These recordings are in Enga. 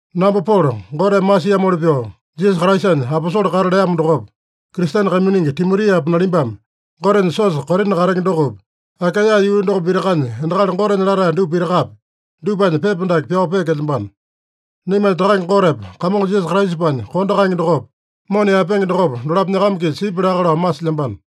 Namba Polo, Goteme masiamoli pyoo Jisasa Kraisanya aposole kata leamo dokopa, Kristene kaiminingi Timotiapa, nalimbame Gotenya siosa Korina katenge dokopi, Akaeya yuu doko pitakanya endakali Gotenya latae dupa pitakapi, dupanya pepa dake pyao peekelyambano. Naimanya Takange Gotepa Kamongo Jisasa Kraisapanya kondo kaenge dokopa, mona yaepenge dokopa, dolapo nyakama-kisa sipya laka lao masilyambano.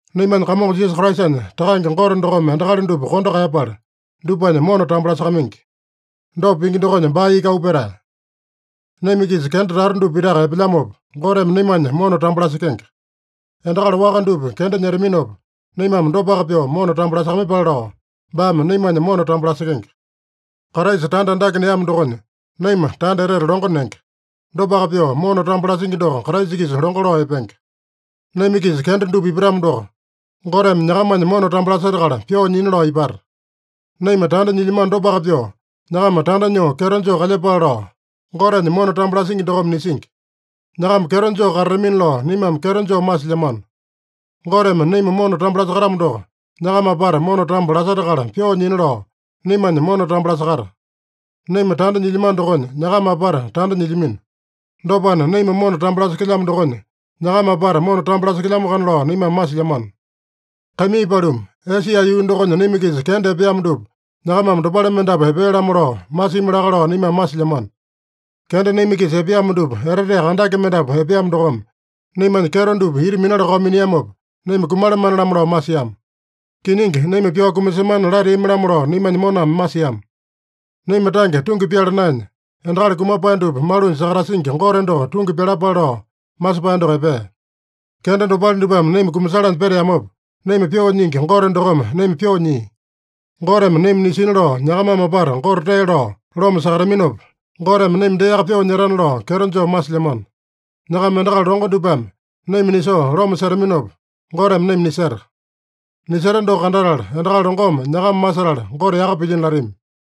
Naimanya Kamongo Jisasa Kraisanya Takange Gote dokome endakali dupa kondo kaeyapala, dupanya mona tambo lasakamaingi. Dopa pingi dokonya baa iki auu petae. Naima-kisa kenda tata dupa pitaka epelyamopa, Goteme naimanya mona tambo lasekenge. Endakali waka dupa kenda nyetaminopa, naimame dopaka pyoo mona tambo lasakamaiyepale lao, baame naimanya mona tambo lasekenge. Kraisa tanda andake neamo dokonya, naima tanda etete longo nenge. Dopaka pyoo, mona tambo lasingi doko Kraisa-kisa longo lao epenge. Naima-kisa kenda dupa ipatamo doko, Goteme nyakamanya mona tambo lasetakala pyoo nyina lao ipata. Naima tanda nyilyamano dopaka pyoo nyakama tanda nyoo kyeto joo kalyepale lao, Gotenya mona tambo lasingi dokome nisingi. Nyakama kyeto joo katatamina lao naimame kyeto joo masilyamano. Goteme naima mona tambo lasakatamo doko, nyakama apata mona tambo lasetakala pyoo nyina lao naimanya mona tambo lasakata. Naima tanda nyilyamano dokonya, nyakama apata tanda nyilyamino. Dopana, naima mona tambo lasekelyamo dokonya, nyakama apata mona tambo lasekelyamoakana lao naimame masilyamano. Kaimii paluma, Esia yuu dokonya naima-kisa kenda epeamo dupa nyakamame dopale mendapu epea-lamo lao masimi laka lao naimame masilyamano. Kenda naima-kisa epeamo dupa, eteteaka andake mendapu epeamo dokome, naimanya kyeto dupa ita minala-kao miniamopa, naima kumalamane-lamo lao masiama. Kiningi, naima pyao kumasemana lateami-lamo lao naimanya moname masiama. Naima tange tungi pyala naenya, endakali kumapae dupa malunya sakatasingi Gote doko tungi pyalapale lao masepae doko epea. Kenda dopale dupame naima kumasalanya peteamopa, naima pyoo nyingi Gote dokome naima pyoo nyia. Goteme naima nisina lao nyakamame apata Gote tee lao loma sakataminopa, Goteme naima deaka pyoo nyetana lao kyeto joo masilyamano. Nyakama endakali longo dupame naima nisoo loma setaminopa, Goteme naima niseta. Niseta doko kandatala, endakali longome nyakama masetala Gote yaka pilyino latami.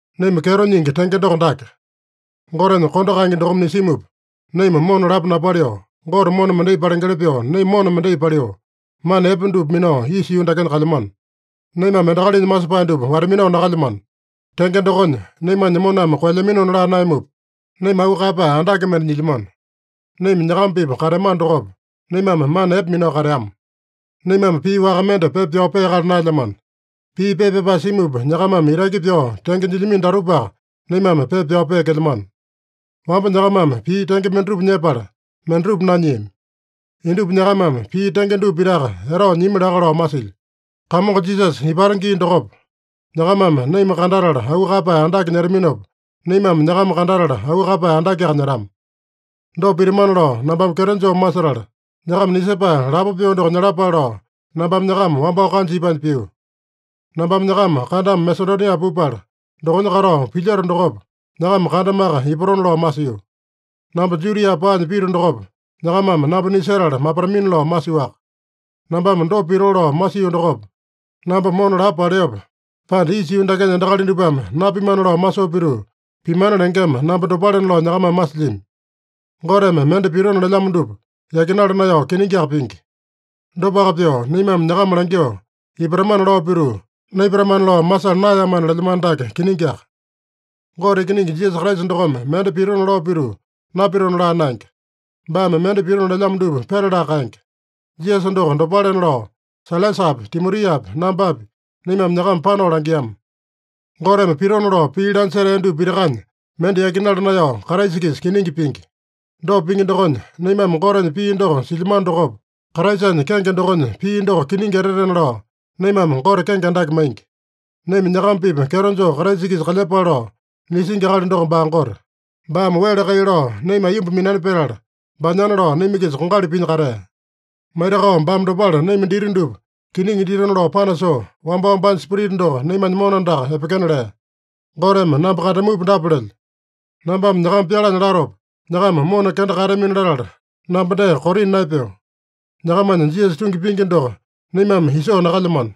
Naima kyeto nyingi tenge doko dake: Gotenya kondo kaenge dokome nisimupa, naima mona lapo napaliu, Gote mona mendai palengeli pyoo naima mona mendai paliu, mana epe dupa minao isa yuu dakenya kalyamano. Naimame endakalinya masepae dupa wata-minao nakalyamano. Tenge dokonya, naimanya moname koelyaminona laa naeyamupa, naima auu kaeyapae andake mende nyilyamano. Naima nyakama-pipa kateamano dokopa, naimame mana epe minao kateama. Naimame pii waka mende pepa pyao peakala naelyamano. Pii pepa pyapae simupa nyakamame itaki pyao tenge nyilyamino datupaka naimame pepa pyao peekelyamano. Wamba nyakamame pii tenge mendatupa nyepala, mendatupa nanyiami. Indupa nyakamame pii tenge dupa pitaka etao nyimi laka lao masilyo: Kamongo Jisasa ipata gii dokopa, nyakamame naima kandatala auu kaeyapae andake nyetaminopa, naimame nyakama kandatala auu kaeyapae andakeaka nyetama. Dopa pitamana lao nambame kyeto joo masetala, nyakama nisepae lapo pyoo doko nyalapale lao, nambame nyakama wambao kanja ipanya pio. Nambame nyakama kandama Masedonia pupala, dokonya katao pilyoto dokopa, nyakama kandamaka ipatona lao masio. Namba Judia paanya pito dokopa, nyakamame namba nisetala mapatamina lao masiowaka. Nambame dopa pitoo lao masio dokopa, namba mona lapo paleope, pande isa yuu dakenya endakali dupame napimana lao masoo pituu, pimana lengema namba dopalena lao nyakamame masilyami? Goteme mende pitona lelyamo dupa yakinala naeyao kiningiaka pingi. Dopaka pyoo, naimame nyakama langyoo “Ipatamana” lao pituu, “Naipatamana” lao masala naeyamana lelyamano dake kiningiaka. Gote Ikiningi Jisasa Kraisa dokome mende pitona lao pituu, napitona laa naenge. Baame mende pitona lelyamo dupa petalaka kaenge. Jisasa doko dopalena lao, Sailasapi, Timotiapi, nambapi, naimame nyakama panao langiama. Goteme pitona lao pii lanya setea dupa pitakanya mende yakinala naeyao Kraisa-kisa kiningi pingi. Dopa pingi dokonya, naimame Gotenya pii doko silyamano dokopa, Kraisanya kenge dokonya pii doko kiningi etetena lao naimame Gote kenge andake maingi. Naima nyakama-pipa kyeto joo Kraisa-kisa kalyepale lao nisingi akali doko baa Gote. Baame wele kai lao naima aiyomba minani petala, baanyana lao naima-kisa kongali pinya katea. Maitakao baame dopale naima dita dupa kiningi ditona lao panasoo, wambao baanya Spirita doko naimanya mona andaka epekena lea. Goteme namba kandamupa dapa lelyo: Nambame nyakama pyalanya latopa nyakama mona kenda kaeyatamini-latala, namba dee Korina naepeo. Nyakamanya Jisasa tungi pingi doko naimame isoo nakalyamano.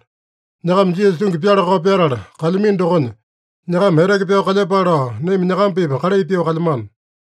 Nyakama Jisasa tungi pyala-kao pyatala kalyamino dokonya, nyakama eteke pyao kalyepale lao naima nyakama-pipa kalai pyoo kalyamano.